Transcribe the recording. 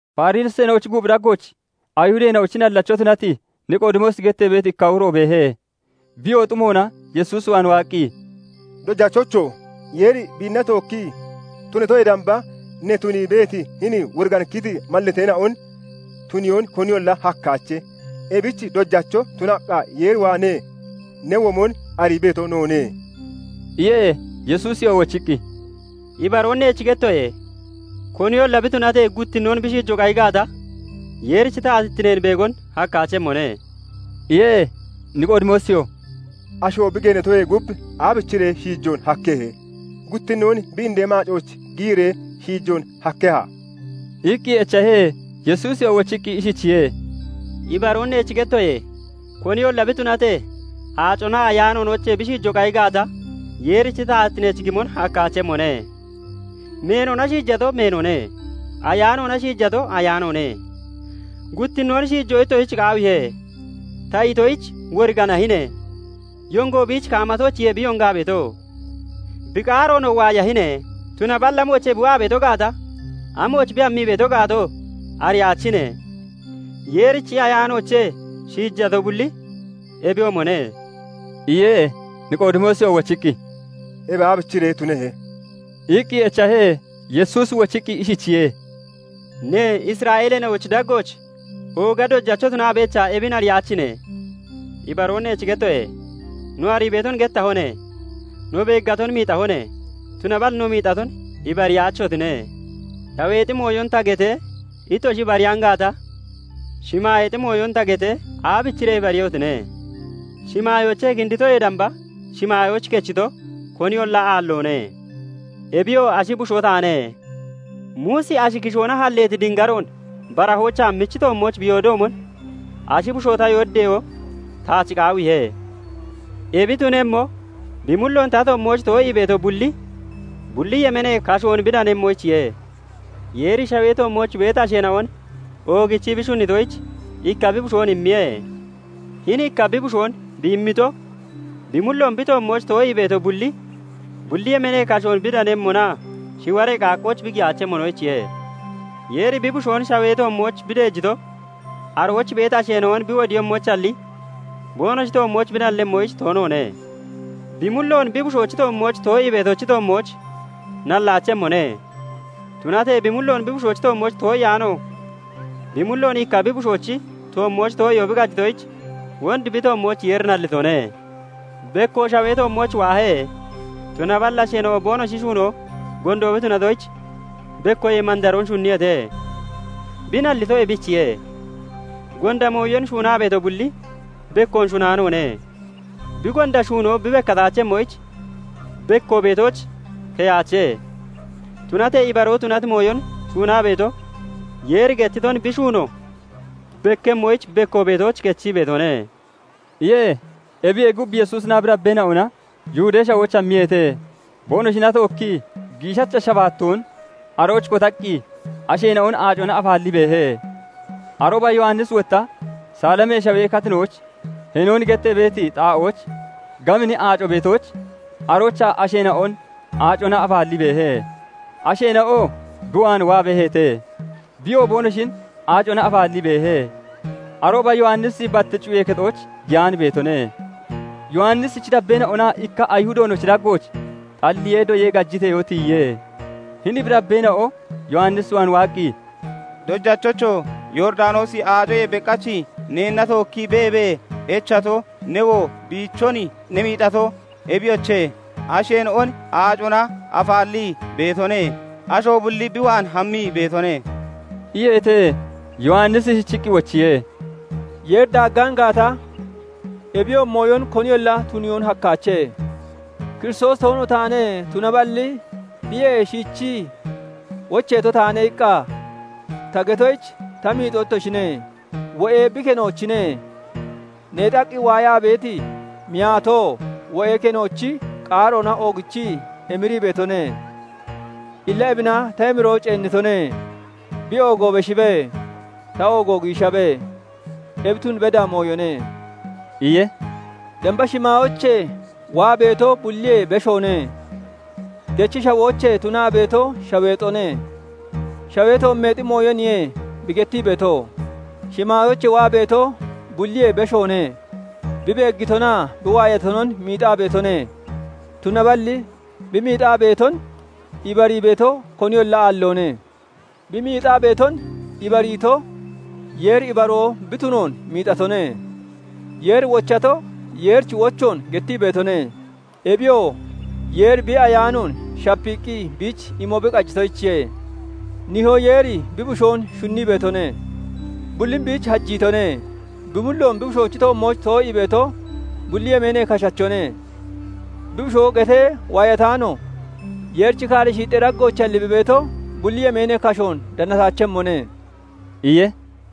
Fariseena'ochi guuphi daggooch Ayihudeena'ochi nallacho tunati Niqoodimoosi gettee beeti ikka uro beehe. Biyoo xumoona Yesuus waan waaqqi, "Dojachocho! Yeeri biinna tookkii tunatoyee damba, ne tunii beeti hini woriganikkiti mallateena'on tuniyoon koniyolla hakkaache. Ebich Dojacho tunaqqa Yeer waanee ne womon arii beeto noone" iye. Yesuusiyoo wochiqqi, "Ibaroon neech gettoye:- Koniyolla bi tunatee, guttinnoon bi shiijo qayi gaata, Yeerichi taatittineen beegon hakkaachemmone" iye. Niqoodimoosiyoo "Asho bi geenatoyee gub, aabichiree shiijoon hakkehe? Guttinnoon bi indee maacooch giyiree shiijoon hakkeha?" iqqi echahe. Yesuusiyoo wochiqqi ishichiye:- "Ibaroon neech gettoye:- Koniyolla bi tunatee, aaconaa Ayaanoonoochee bi shiijo qayi gaata, Yeerichi taatittineech gimon hakkaachemmone. Meenona shiijato meenone; Ayaanoona shiijato ayaanoone. 'Guttinnoon shiijo ittoshich qaawiihe' ta itoyich, woriganiyaahine! Yongo biich kaamammoochiye bi yongaa beeto; bi qaaroonoo waayahine' tunaballi amoochee bi waa beeto gaata, amooch bi hammii beeto gaatoo ariyaachine. Yeerichi Ayaanoochee shiijato bulli ebiyoomone" iye. Niqoodimoosiyoo wochiqqi, "Ebi aabichiree tunehe?" iqqi echahe. Yesuusi wochiqqi ishichiye:- "Ne, Isra'eeleena'ochi daggooch ooga dojacho tunaa beechaa, ebin ariyaachine? Ibaroon neech gettoye:- No arii beeton gettahone; no beeggaton miixahone; tunaballi no miixaton ibariyaachotine. Shaweexi mooyon ta getee, ittoshi ibariyaan gaata, shimaayeexi mooyon ta getee, aabichiree ibariiyehotine? Shimaayoochee kinditoyee damba shimaayooch kechito koniyolla aalloone; ebiyoo Ashi Bushoo taane. Muusi ashi kishoona halleeti dingaroon barahoochaa michi toommooch bi yoodoomon, Ashi Bushoo ta yooddeyoo taach qaawiihe; Ebi tunemmo, bi mulloon ta toommooch too'ii beeto bulli, bulli yemeenee kashoon bi danemmoyichiye. "Yeeri shawee toommooch beeti asheena'on oogichii bi shunnitoyich ikka bi Bushoon immiye; hini ikka bi Bushoon bi immito, bi mulloon bi toommooch too'ii beeto bulli, bulli yemeenee kashoon bi danemmonaa shiwaree qaaqqooch bi giyaachemmonoyichiye. Yeeri bi Bushoon shawee toommooch bi deejito, arooch beeti asheena'on bi wodiiyemmoyichalli, boonoshi toommooch bi nallemmoyich toonoone. Bi mulloon bi Bushoochi toommooch too'ii beetochi toommooch nallaachemmone; tunatee bi mulloon bi Bushoochi toommooch too'iyaano, bi mulloon ikka bi Bushoochi toommooch too'iyoo bi qajitoyich, wond bi toommooch Yeeri nallitone. Bekko shawee toommooch waahe; tunaballi asheena'o boonoshi shuunoo gondo bi tunatoyich, bekkoyee mandaroon shunniyeete; bi nallito ebichiye. Gonda mooyon shuunaa beeto bulli bekkoon shunnaanoone; bi gonda shuunoo bi bekkataachemmoyich, bekko beetooch keyaache; Tunatee ibaroo tunati mooyon shuunaa beeto, Yeeri gettiton bi shuuno bekkemmoyich, bekko beetooch kechii beetone" iye. Ebiyee gub, Yesuusinaa bi dabbeena'ona Yihudee Shawooch hammiyeete; boonoshina tookkii giishacha shabaattoon arooch kotaqqi asheena'on aacona afaallii beehe. Arooba Yowannisi wotta Saliimee Shawee katinooch Heenoon gettee beeti xaa'ooch gabini aaco beetoyich, aroochaa asheena'on aacona afaallii beehe; asheena'oo bi waan waa beeheete; biyoo boonoshin aacona afaallii beehe. Arooba Yowannisi bat cuyee kexooch giyaan beetone. Yowannisichi dabbeena'onaa ikka Ayihudoonochi daggooch xalliyee doyee gajiteyoo tiyiye. Hini bi dabbeena'o Yowannis waan waaqqi, "Dojachocho! Yooridanoosi Aacoyee beqach neenna tookkii beebee echato, newoo biichon ne miixato, ebiyoche, asheena'on aacona afaallii beetone; asho bulli bi waan hammii beetone" iyeete. Yowannisi ishichiqqi wochiye:- "Yeeri daaggaan gaata, ebiyoomi mooyon koniyolla tuniyoon hakkaache. 'Kiristoosi toono taane; tunaballi biyee shiichii wocheeto taane' iqqa ta getoyich ta miixoo ittoshine. Wo'e bi kenoochine; neexaqqi waayaa beeti miyaatoo wo'ee kenoochi qaaroona oogichii emirii beetone. Illa ebina ta emiroo ceennitone. Bi oogo beshibe; ta oogo giishabe; ebi tun beda mooyone" iye. "Damba shimaayoochee waa beeto bulliyee beshoone; dechi shawoochee tunaa beeto shaweexone; shawee toommeexi mooyoniye bi gettii beeto. Shimaayoochee waa beeto bulliyee beshoone. Bi beeggitonaa bi waayatonon miixaa beetone; tunaballi bi miixaa beeton ibarii beeto koniyolla aalloone. Bi miixaa beeton ibariito, Yeeri ibaroo bi tunoon miixatone. Yeeri wochato, Yeerichi wochoon gettii beetone; Ebiyoo Yeeri bi Ayaanoon shapiiqqi biich imo bi qajitoyichiye. Nihoo Yeeri bi Bushoon shunnii beetone; bullin biich hajiitone. Bi mulloon bi Bushoochi toommooch too'ii beeto, bulli yemeenee kashachone; bi Bushoo getee waayataano Yeerichi kaaree shiixxee daggoochalli bi beeto, bulli yemeenee kashoon danataachemmone" iye.